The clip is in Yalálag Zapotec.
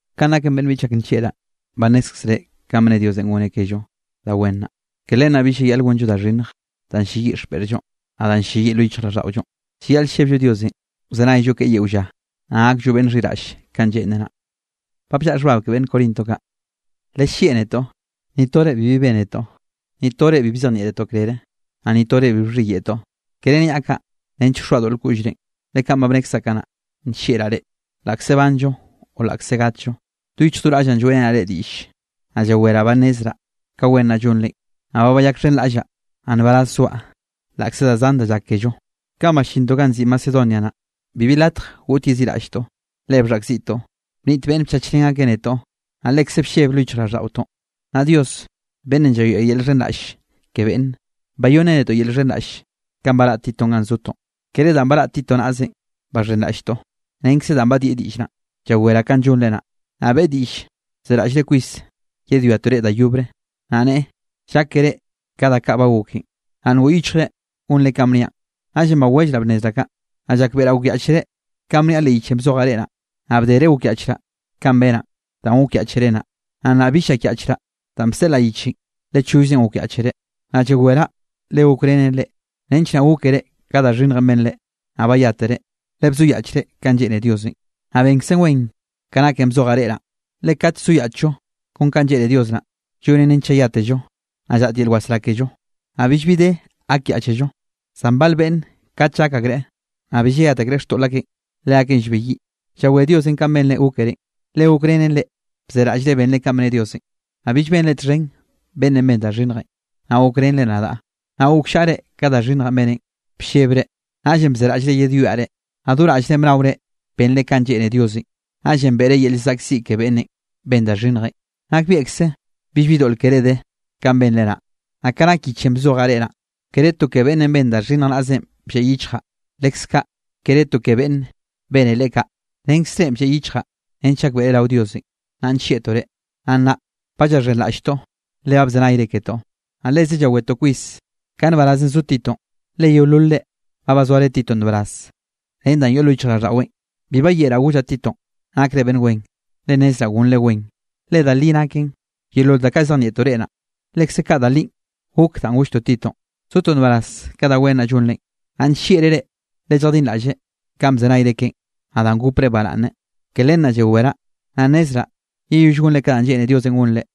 Kanꞌ naken beꞌnn biꞌchaꞌ ak nllieꞌraꞌ, ba nnézkzere kanꞌ bne Diosenꞌ goneꞌ kello da wen naꞌ. Ke len naꞌ bill llayaꞌl gonllo da xhinnj danꞌ ll-lleyiꞌ xpeꞌrllonꞌ naꞌ danꞌ ll-lleyiꞌ lo yichjraꞌlldaꞌollonꞌ. Llayaꞌl llebllo Diosenꞌ wzenayllo keꞌe yeo lla, naꞌ gakllo beꞌnn xhiraꞌll kanꞌ lleꞌnreꞌ naꞌ. Lellieꞌ netoꞌ. Ni tore bibi bénetoꞌ. Ni tore bi bzejnieꞌtoꞌ krere, naꞌ ni tore bi bxhiyeꞌtoꞌ. Kere niaꞌ kaꞌ nench wxoaꞌ doꞌl koꞌllrenꞌ, le kaꞌn ba bnekzaꞌ kanaꞌ, nllieꞌraꞌ reꞌ, laꞌkze banllo o laꞌkze gatllo. Do yichj do raꞌllaꞌ lloeꞌrenaꞌ reꞌ diꞌll, naꞌ llaweraꞌ ba bnnezraꞌ ka wen naꞌ llonre. Naꞌ ba bayakxhenraꞌllaꞌ, naꞌ nbaraz zoaꞌ laꞌkze da zan da llak kello. Kanꞌ ballintoꞌ ganꞌ nziꞌi Macedonia naꞌ, bibi latj goꞌt yeziꞌraꞌlltoꞌ, le bxhaꞌkziꞌtoꞌ. Bniꞌt beꞌnne bchachrén akeꞌ netoꞌ, naꞌ lekze blleb lo yichjraꞌlldaꞌotoꞌ. Naꞌ Dios beꞌnnenꞌ llayoeꞌ yel llxhenraꞌll ke beꞌnne, bayonneꞌ netoꞌ yel llxhenraꞌll kanꞌ baraꞌ Titonꞌ ganꞌ zotoꞌn. Kere danꞌ baraꞌ Tito naꞌzenꞌ baxhenraꞌlltoꞌ, renkze danꞌ badieꞌ diꞌll naꞌn, llawereꞌ kanꞌ llonre naꞌ. Naꞌ beꞌe diꞌll zeraꞌllre kwis yedwiatoꞌ reꞌ da yobre. Naꞌ neꞌe, llákere ka da kaꞌ ba goken, naꞌ ngoꞌ yichjre gonre kanꞌ bniaꞌn. Naꞌllenꞌ bawellraꞌ bnnezraꞌ kaꞌ. Naꞌ llakbeꞌraꞌ gokyaꞌchere kanꞌ bniaꞌ leꞌ yichenꞌ bzojaꞌ reꞌ naꞌ. Naꞌ bdere gokyaꞌchraꞌ kanꞌ benaꞌn danꞌ gokyaꞌchere naꞌ, naꞌ nnaꞌ bill llakyaꞌchraꞌ danꞌ bseꞌlaꞌ yichenꞌ, le chollzenꞌ gokyaꞌchere. Nnaꞌ llaweraꞌ le gokrenen reꞌ, nench naꞌ gókere ka da xhinnjenꞌ benre, naꞌ bayátere, le bzoyaꞌchre kanꞌ lleꞌne Diosenꞌ. Naꞌ benkzen wen ke naken bzojaꞌ reꞌ naꞌ. Le kat llzoyaꞌchllo kon kanꞌ lleꞌne Dios naꞌ, llonen nench llayátello, naꞌ llaꞌt yel wasrá kello, naꞌ billbi de gakyaꞌchello. Zan bal beꞌnn kate llak akreꞌ, naꞌ bi llayat akreꞌ xtoꞌl akeꞌn, leakeꞌn llbeyiꞌ. Llawé Diosenꞌ kanꞌ benre gókere, le gokrenen reꞌ bzeraꞌllre benre kanꞌ bne Diosenꞌ. Naꞌ bill benre txhen beꞌnnenꞌ ben da xhinnjenꞌ, naꞌ gokrenre nadaꞌ, naꞌ gokllaꞌre ka da xhinnjenꞌ beneꞌn. Bllebre, naꞌllenꞌ bzeraꞌllre yedwiaꞌ reꞌ, naꞌ do raꞌllre bnaore benre kanꞌ lleꞌne Diosenꞌ. Naꞌllenꞌ beꞌre yel llzaꞌkziꞌ ke beꞌnnenꞌ ben da xhinnjenꞌ. Nakbieꞌkze billbi doꞌl keré de kanꞌ benre naꞌ. Naꞌ ka nak yichenꞌ bzojaꞌ reꞌ naꞌ, kere to ke beꞌnnenꞌ ben da xhinnj naꞌzenꞌ blleꞌ yichjaꞌ, leskaꞌ kere to ke beꞌnnenꞌ bene leꞌe kaꞌ. Renkzrenꞌ blleꞌ yichjaꞌ nench gakbeꞌre rao Diosenꞌ, nna nllieꞌtoꞌ reꞌ. Naꞌ nnaꞌ ba llaxhenraꞌlltoꞌ le ba bzenayre ketoꞌ. Naꞌ leze llawetoꞌ kwis ka nbarazenꞌ zo Titonꞌ, le yeololre ba bazoare Titonꞌ nbaraz ren da yoꞌ lo yichjraꞌlldaꞌweꞌn. Bi bayeꞌraꞌ gollaꞌ Titonꞌ nakre beꞌnn wen, le nnezraꞌ gonre wen. Le da linꞌ nake yeolol da kaꞌ llzejnieꞌtoꞌ reꞌ naꞌ, lekze kaꞌ da li gok danꞌ golltoꞌ Titonꞌ, zotoꞌ nbaraz ka da wen naꞌ llonrenꞌ. Naꞌ nllieꞌllreꞌ reꞌ le lljadinraꞌlleꞌ kanꞌ bzenayre keꞌen, naꞌ danꞌ gopreꞌ baraꞌnne. Ke len naꞌ llaweraꞌ, naꞌ nnezraꞌ yeyoll gonre ka danꞌ lleꞌne Diosenꞌ gonre.